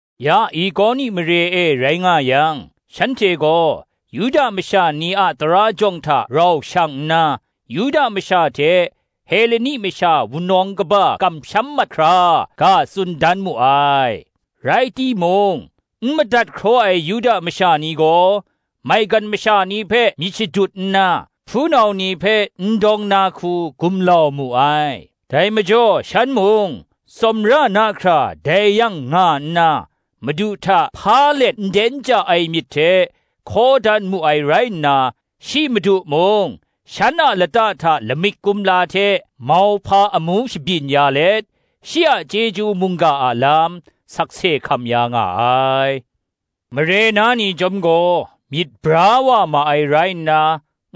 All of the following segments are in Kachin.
Ya Ikoni mare e rai nga yang, shanhte gaw Yuda masha ni a tara jawng hta rau shang nna, Yuda masha hte Heleni masha wunawng kaba kamsham mat hkra, ga tsun dan mu ai. Rai timung, n madat hkraw ai Yuda masha ni gaw, maigan masha ni hpe myit shadut nna, hpunau ni hpe n dawng na hku gumlau mu ai. Dai majaw shan mung tsawmra na hkra dai yang nga nna, Madu hta hpa let nden ja ai myit hte hkaw dan mu ai rai nna, shi Madu mung, shan a lata hta lamik kumla hte mauhpa amu shabyin ya let, shi a chyeju mungga a lam, sakse hkam ya nga ai. Mare na ni chyawm gaw myit bra wa ma ai rai nna,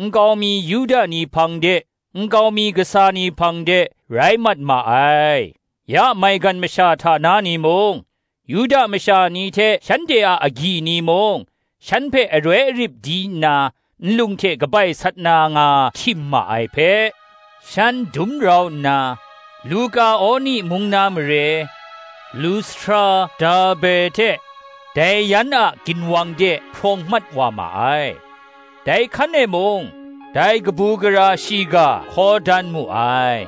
nkau mi Yuda ni hpang de, nkau mi kasa ni hpang de, rai mat ma ai. Ya maigan masha hta na ni mung, Yuda masha ni hte shanhte a agyi ni mung, shan hpe aroi arip di nna nlung hte kabai sat na nga htim ma ai hpe, shan dum rau nna, Lukaoni mung na mare, Lustra, Derbe hte dai yan a ginwang de hprawng mat wa ma ai: dai hkan e mung dai kabu gara shiga hkaw dan mu ai.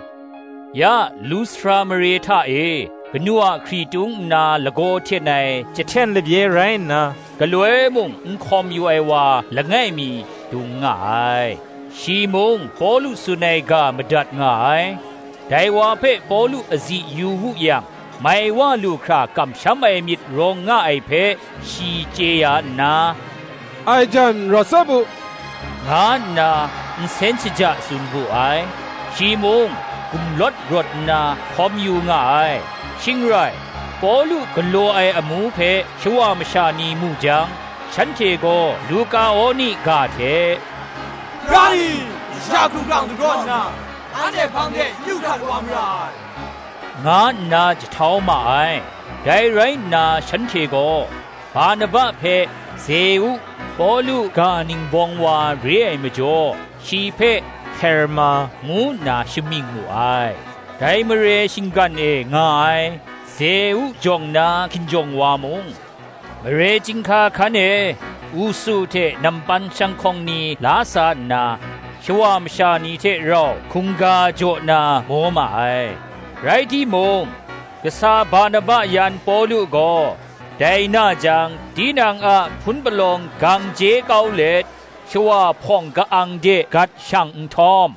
Ya Lustra mare hta e, kanu a hkritung nna lagaw hten ai chyahten labye rai nna, galoi mung n hkawm yu ai wa langai mi, dung nga ai. Shi mung Pawlu tsun ai ga madat nga ai; dai wa hpe Pawlu azi yu wu yang mai wa lu hkra kamsham ai myit rawng nga ai hpe shi chye ya nna, “Ai jan rawt tsap u,” nga nna, nsen shaja tsun wu ai; shi mung, gumlawt rawt nna hkawm yu nga ai. Shing rai, Pawlu galaw ai amu hpe shawa masha ni mu jang, shanhte gaw Lukaoni ga hte, “Hpara ni, masha hkumhkrang dagraw nna, anhte hpang de yu hkrat wa mara ai,” nga nna jahtau ma ai. Dai rai nna shanhte gaw, Barnaba hpe Zeu, Pawlu ga ningbawng wa re ai majaw, shi hpe Herma, ngu nna shamying mu ai. Dai mare shinggan e nga ai Zeu jawng na hkinjawng wa mung, mare chyinghka hkan e usu hte nampan shanghkawng ni la sa nna, shawa masha ni hte rau hkungga jaw na maw ma ai. Rai timung, kasa Barnaba yan Pawlu gaw dai na jang tinang a hpun palawng gang je kau let, shawa hpawng ka-ang de gat shang nhtawm,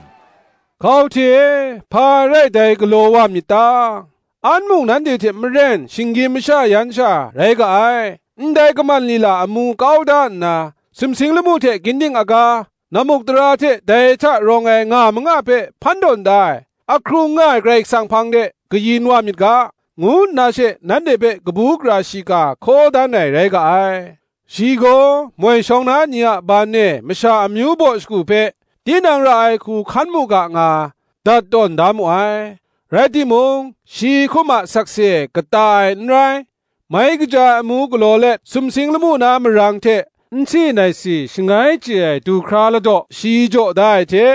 “Hkau hte e, hpa rai dai galaw wa myit ta? An mung nanhte hte maren shinggyim masha yan sha rai ga ai; ndai kaman lila amu kau da nna, sumsing lamu hte ginding aga, nammukdara hte dai hta rawng ai nga manga hpe hpan tawn da ai, ahkrung nga ai Karai Kasang hpang de kayin wa myit ga, ngu nna she nanhte hpe kabu gara shiga hkaw dan ai rai nga ai. Shi gaw, moi shawng na ni a ban e masha amyu baw shagu hpe, tinang ra ai hku hkan mu ga nga, dat tawn da mu ai; rai timung, shi hkum a sakse kata ai n rai; mai kaja ai amu galaw let sumsing lamu na marang hte, nsi naisi shangai chye ai duhkra ladaw shi jaw da ai hte,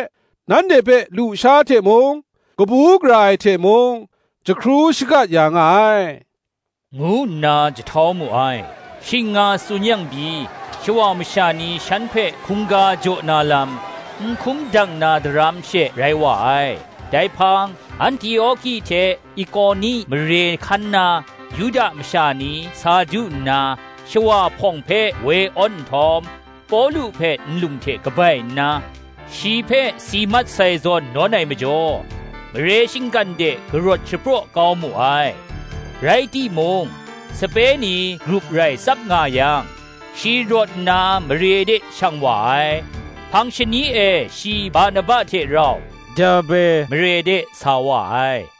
nanhte hpe lusha hte mung kabu gara ai hte mung, jahkru shakat ya nga ai,” ngu nna jahtau mu ai. Shing nga tsun yang pyi, shawa masha ni shan hpe hkungga jaw na lam, n hkum dang na daram she rai wa ai. Dai hpang, Antioki hte Ikoni mare hkan na Yuda masha ni sa du nna, shawa hpawng hpe woi awn nhtawm, Pawlu hpe nlung hte kabai nna, shi hpe si mat sai zawn nawn ai majaw, mare shinggan de karawt shapraw kau mu ai. Rai timung, sape ni grup rai tsap nga yang, shi rawt nna mare de shang wa ai; hpang shani e shi Barnaba hte rau Derbe mare de sa wa ai.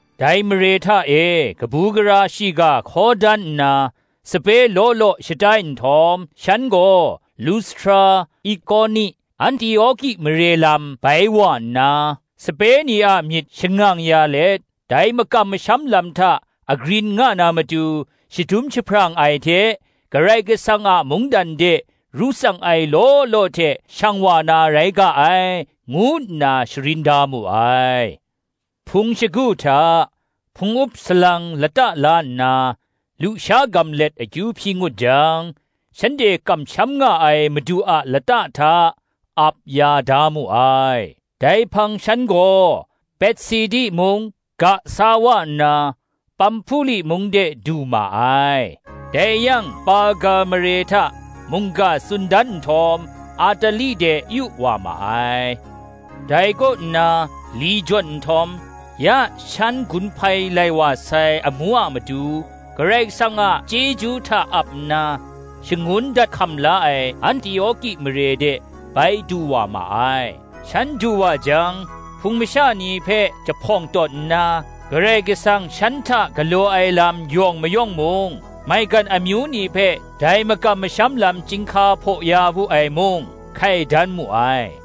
Dai mare hta e kabu gara shiga hkaw dan nna, sape law law shatai nhtawm, shan gaw, Lustra, Ikoni, Antioki mare lam bai wa nna sape ni a myit shangang ya let, dai makam masham lam hta agrin nga na matu shadum jahprang ai hte, “Karai Kasang a mungdan de ru tsang ai law law hte shang wa na rai ga ai,” ngu nna sharin da mu ai. Hpung shagu hta, hpung up salang lata la nna, lusha gam let akyu hpyi ngut jang, shanhte kamsham nga ai Madu a lata hta, ap ya da mu ai. Dai hpang shan gaw, Pesidi mung ga sa wa nna, Pamhpuli mung de du ma ai. Dai yang Perga mare hta mungga tsun dan nhtawm, Atali de yu wa ma ai; dai kaw nna li jawn nhtawm, ya shan gun hpai lai wa sai amu a matu, Karai Kasang a chyeju hta ap nna, shangun dat hkam la ai Antioki mare de bai du wa ma ai. Shan du wa jang, Hpung masha ni hpe jahpawng tawn nna, Karai Kasang shan hta galaw ai lam yawng mayawng mung, maigan amyu ni hpe dai makam masham lam chyinghka hpaw ya wu ai mung, hkai dan mu ai.